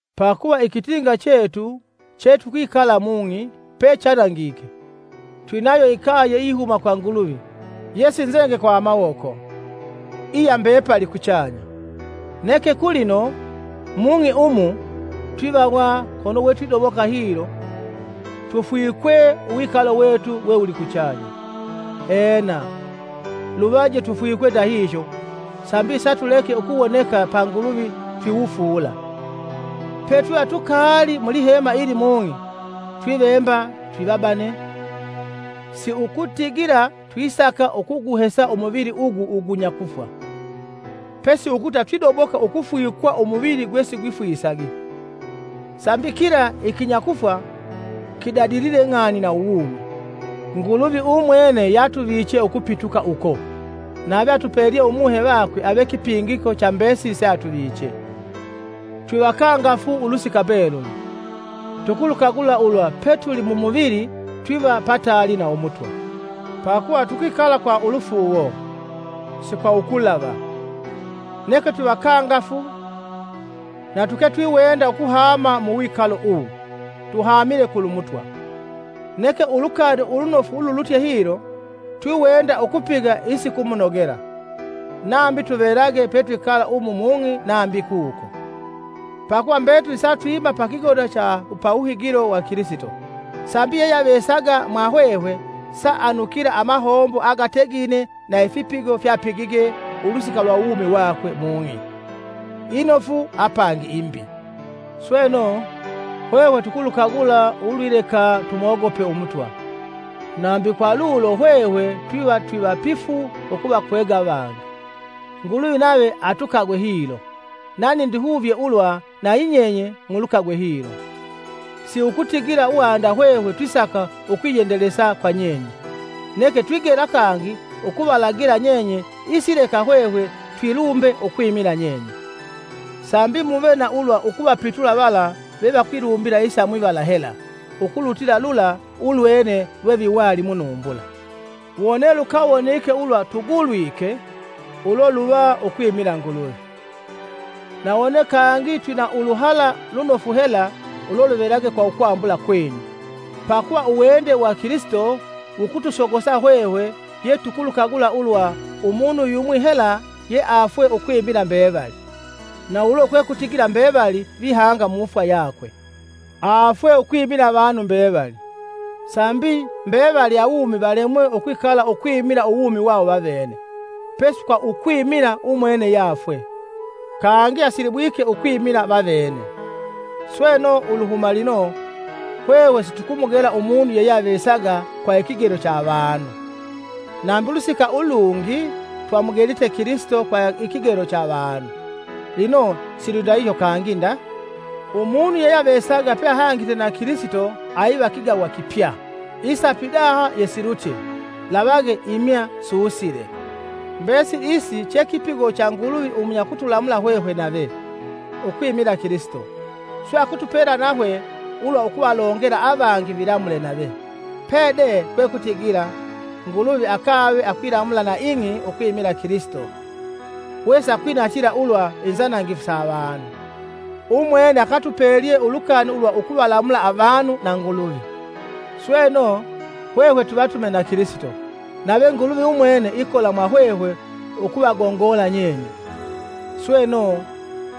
Pakuva ikitinga chetu chetukwikala mung'i, chanangitwe, twinayo ikaye iyihuma kwa Nguluvi, yesinzenge kwa mawoko, iya mbepali kuchanya. Neke kulino, mung'i umu twivawa kono we twidoboka hilo, tufwikwe uwikalo wetu we wuli kuchanya. Ena, luvaje tufwikwe ndahihyo sambi satuleke ukuwoneka pa Nguluvi twiwufula. Petwiva tukaali mulihema ili mung'i, twivemba twivabane; si ukutigila twisaka ukuguhesa umuvili ugu ugunya kufwa, pesi ukuta twidoboka ukufwikwa umuvili gwesigwifwisagi, sambi kila ikinyakufwa kidadilile ng'ani na uwumi. Nguluvi umwene yatuviche ukupituka uko, nave atupelye Umuhe vakwe ave kipingiko cha mbesili seatuvichee. Twivakangafu ulusika mbeluli, tukulukagula ulwa ukwilegeha kwikala mumuvili twiva pataali na Umutwa. Pakuva tukwikala kwa ulufuuwo, si kwa ukulava. Neke twivakangafu na tuketwiwenda ukuhama mu wikalo uwu, tuhamile kulu Mutwa. Neke ulukani ulunofu ululutye hilo, twiwenda ukupiga isikumunogela, nambi tuvelage petwikala umu mung'i nambi kuko. Pakuva mbetuli satwima pa kigoda cha pawuhigilo cha Kilisito, sambi yeyeavesaga mwa hwehwe saanukila amahombo agategine na ifipigo fyapigige ulusika lwa uwumi wakwe mung'i, inofu apangi imbi. Sweno, hwehwe tukulukagula ulwileka tumogope Umutwa, nambi kwa lulo hwehwe twiva twivapifu ukuvakwega avangi. Nguluvi nave atukagwe hilo, nani ndihuvye ulwa nanyinyenye mulukagwe hilo. Si ukutigila wanda hwehwe twisaka ukwiyendelesa kwa nyenye, neke twigela kangi ukuvalagila nyenye isileka hwehwe twilumbe ukwimila nyenye, sambi muve na ulwa ukuvapitula vala vevakwilumbila isa mwivala hela ukulutila lula ulwene lweviwali munumbula. Wone lukawonike ulwa tugulwike, ulo luva ukwimila Nguluvi; na wone kangi twina uluhala lunofu hela, ulo luvelage kwa ukwambula kwenyu. Pakuva uwende wa Kilisito wukutusogosa hwehwe yetukulukagula ulwa umunu yumwi hela yeafwe ukwimila mbevali, na ulo kwekutigila mbevali vihanga mufwa yakwe. Afwe ukwimila avanu mbevali, sambi mbevali awumi valemwe ukwikala ukwimila uwumi wawo vavene, pesi kwa ukwimila umwene yafwe, kangi asilibwike ukwimila vavene. Sweno, uluhuma lino, hwehwe situkumugela umunu yeyeavesaga kwa ikigelo cha avanu. Nambi ulusika ulungi twamugelite Kilisito kwa ikigelo cha avanu, lino silwindahihyo kangi nda. Umunu yeyeavesaga peahangite na Kilisito aiva kigawa kipya, isa pidaha yesilutye, lavage imya susile. Mbesili isi che kipigo cha Nguluvi umunya kutulamula hwehwe nave, ukwimila Kilisito, swe akutupela nahwe ulwa ukuvalongela avangi vilamule nave. Pede kwekutigila: Nguluvi, akave akwilamula na ing'i ukwimila Kilisito, wesakwinatila ulwa inzanangifu sa avanu. Umwene akatupelye ulukani ulwa ukuvalamula avanu na Nguluvi. Sweno, hwehwe twivatume na Kilisito, nave Nguluvi umwene ikola mwa hwehwe ukuvagongola nyenye. Sweno,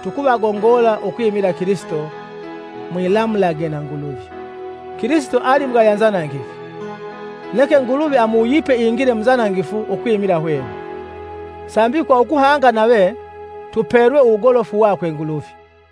tukuvagongola ukwimila Kilisito, mwilamulage na Nguluvi. Kilisito ali mugaya nzanangifu, neke Nguluvi amuwuyipe ingile mu nzanangifu ukwimila hwehwe, sambi kwa ukuhanga nave, tupelwe uwugolofu wakwe Nguluvi.